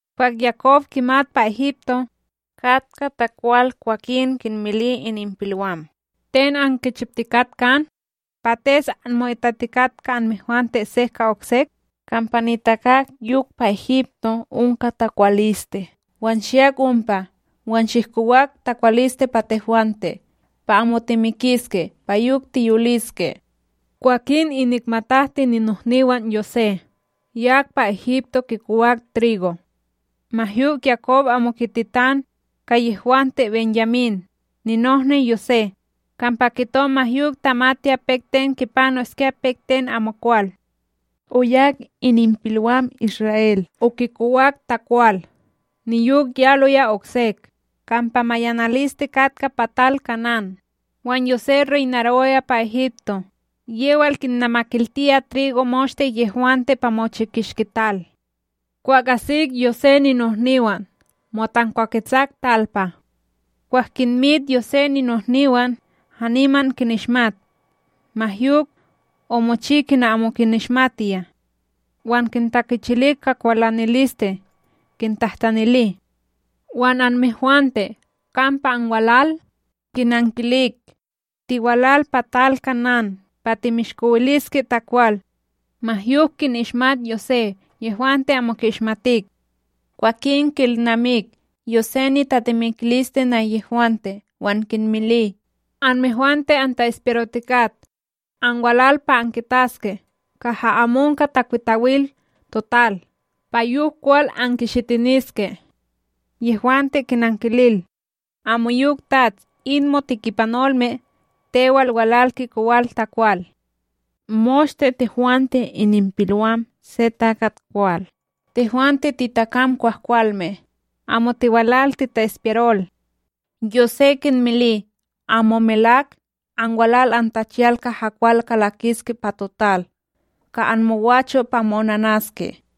Kwah Yakob kimat kampa pa Egipto, katka takwal kwakin kinmili ininpilwam: “Ten ankichiptikak kan, pates anmo'itatikat ka anmehwante sek ka oksek? Kampa nitakak yok pa Egipto onka takwaliste, wan shiyak ompa wan shihkowak takwaliste pa tehwante, pa amo timikiske, pa yok tiyoliske.” Kwakin inik matahti ninohniwan Yosé yak pa Egipto kikowak trigo. Ma yok Yakob amo kititan ka yehwante BenYamín, ninohni Yosé, kampa ma yok tamatiya pek ten kipanoskya pek ten amokwal. Oyak ininpilwam Isra'El okikowak takwal, niyok yaloya oksek, kampa mayanaliste katka pa tal Kanán. Wan Yosé reynarowaya pa Egipto, yewal kinnamakiltiya trigo moshte yehwante pa mochi kishki tal. Kwah asik Yosé ninohniwan, motankwaketsak talpa. Kwah kinmit Yosé ninohniwan, haniman kinishmat; ma yok, omochi kina amo kinishmatiya, wan kintakichili ka kwalaniliste; kintahtanili: ―Wan anmehwante!, kampa anwalal? Kinankilik: ―Tiwalal pa tal Kanán, pa timishkowiliske takwal. Ma yok kinishmat Yosé, yehwante amo ki'ishmatik. Kwakin ki'ilnamik Yosé nitatemikiliste nahyehwante, wan kinmili: ―Anmehwante anta'ispiyarotikat, anwalal pa ankitaske kaha amo onka takwitawil total pa yok kwal ankishitiniske! Yehwante kinankilil: ―Amoyok, Tats! In motikipanolme tewal, walal kikowal takwal. Moshte tehwante ininpilwam se takat kwal, tehwante titakam kwahkwalme. Amo tiwalal tita'ispiyarol! Yosé kinmili: ―Amo melak! Anwalal antachiyal kaha kwal kalakiske pa total ka anmogwacho' pa mo'onanaske.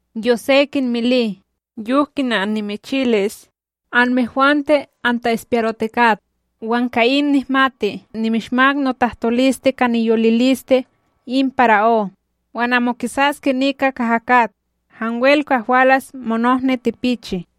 Yosé kinmili: ―Yok kina annimichilis. Amehwante anta'ispiyarotikat! Wan ka in nihmati: Nimishmak notahtoliste ka niyoliliste in para'ó, wan amo kisaske nika kaha kat hanwel kwah walas monohni tipichi.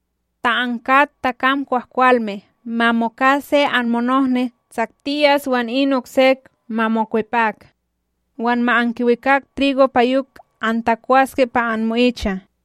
Ta ankat takam kwahkwalme, ma moka se anmonohni tsaktiyas wan in oksek ma mokwepak wan ma ankiwikak trigo pa yok antakwaske pa anmo'icha.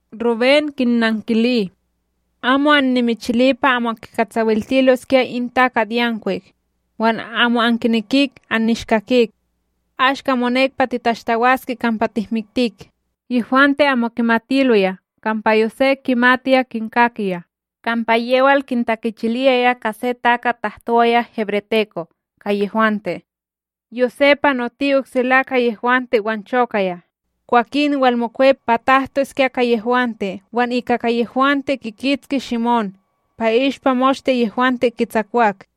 Rubén kinnankili: ―Amo annimichili pa amo kikatsawiltiloskya in takatYankwik, wan amo ankinekik annishkakik. Ashka monek pa titashtawaske kampa tihmiktik! Yehwante amo kimatiloya kampa Yosé kimatiya kinkakiya, kampa yewal kintakichiliyaya ka se takat tahtowaya hebreteko ka yehwante. Yosé panoti oksela ka yehwante wan chokaya, kwakin, walmokwep pa tahtoskya ka yehwante, wan ika ka yehwante kikitski Shime'ón pa i'ishpa moshte yehwante kitsakwak.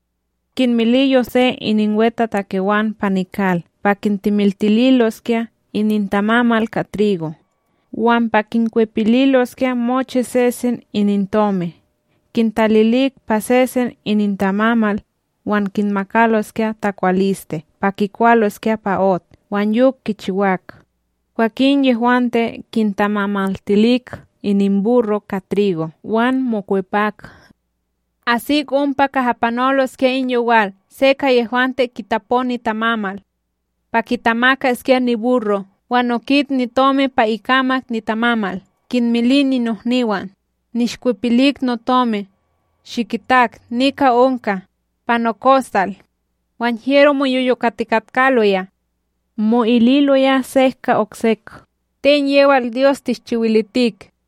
Kinmili Yosé ininwetatakewan pa nikal pa kintemiltililoskya inintamamal ka trigo, wan pa kinkwepililoskya mochi sesen inintomi kintalilik pa sesen inintamamal, wan kinmakaloskya takwaliste pa kikwaloskya pa ot. Wan yok kichiwak. Kwakin yehwante kintamamaltilik ininburro' ka trigo wan mokwepak. Asik ompa kaha panoloskya in yowal se ka yehwante kitapo nitamamal pa kitamakaskya niburro, wan okit nitomi pa ikamak nitamamal! Kinmili ninohniwan: ―Nishkwepilik notomi! Shikitak, nika onka, pa nokostal! Wan hyero moyoyokatikatkaloya, mo'ililoya sek ka oksek: ―Ten yewal Dyos tishchiwilitik?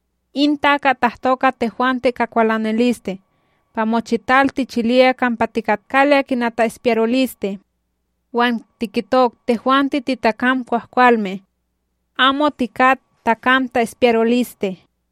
―In takat tahto ka tehwante ka kwalaniliste pa mochital tichiliyaya kampa tikatkaloya kina ta'ishpiyaroliste. Wan tikitok: “Tehwante titakam kwahkwalme. Amo tikat takam ta'ispiyaroliste.”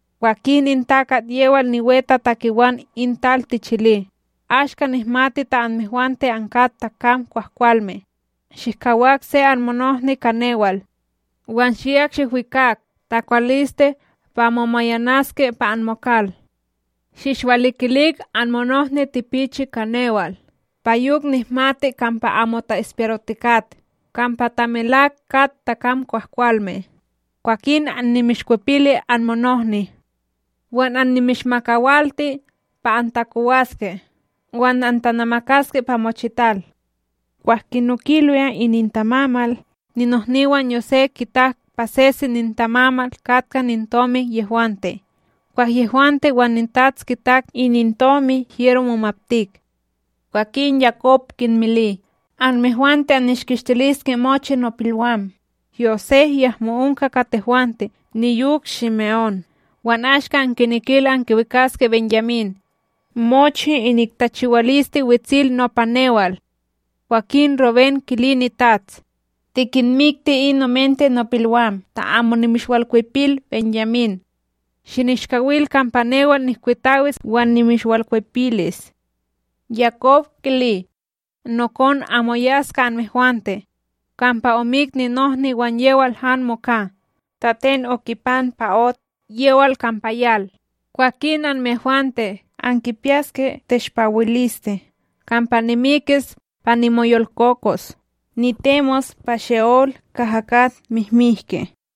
’Kwakin in takat yewal niwetatakewan in tal tichili: “Ashka nihmati ta anmehwante ankat takam kwahkwalme: Shihkawak se anmonohni, ka newal wan shiyak shihwikak takwaliste pa amo mayanaske pa anmokal. Shinishwalikilik anmonohni tipichi ka newal. Pa yok nihmati kampa amo ta'ispiyarotikat kampa ta melak kat takam kwahkwalme. Kwakin annimishkwepili anmonohni, wan annimishmakawalti pa antakowaske wan antanamakaske pa mochital.” Kwah kinokiloya inintamamal, ninohniwan Yosé kitak pa sesen inintamamal katka inintomi yehwante. Kwah yehwante wan nitats kitak inintomi, hyero momaptik. Kwakin Yakob kinmili: ―Anmehwante annishkistiliske mochi nopilwam! Yosé yahmo onka ka tehwante, niyok Shime'ón, wan ashka ankinekil ankiwikaske BenYamín! Mochi inik tachiwaliste wetsil nopa newal! Kwakin Rubén kili nitats: ―Tikinmikti in omente nopilwam ta amo nimishwalkwepil BenYamín. Shinishkawil kampa newal nihkwitawis wan nimishwalkwepilis. Yakob kili: ―Nokon amo yas ka anmehwante! Kampa omik ninohni, wan yewal han moka. Ta ten okipan pa ot yewal kampa yal, kwakin anmehwante ankipiyaske teshpawiliste kampa nimikis pa nimoyolkokos nitemos pa She'ola kaha kat mihmihke.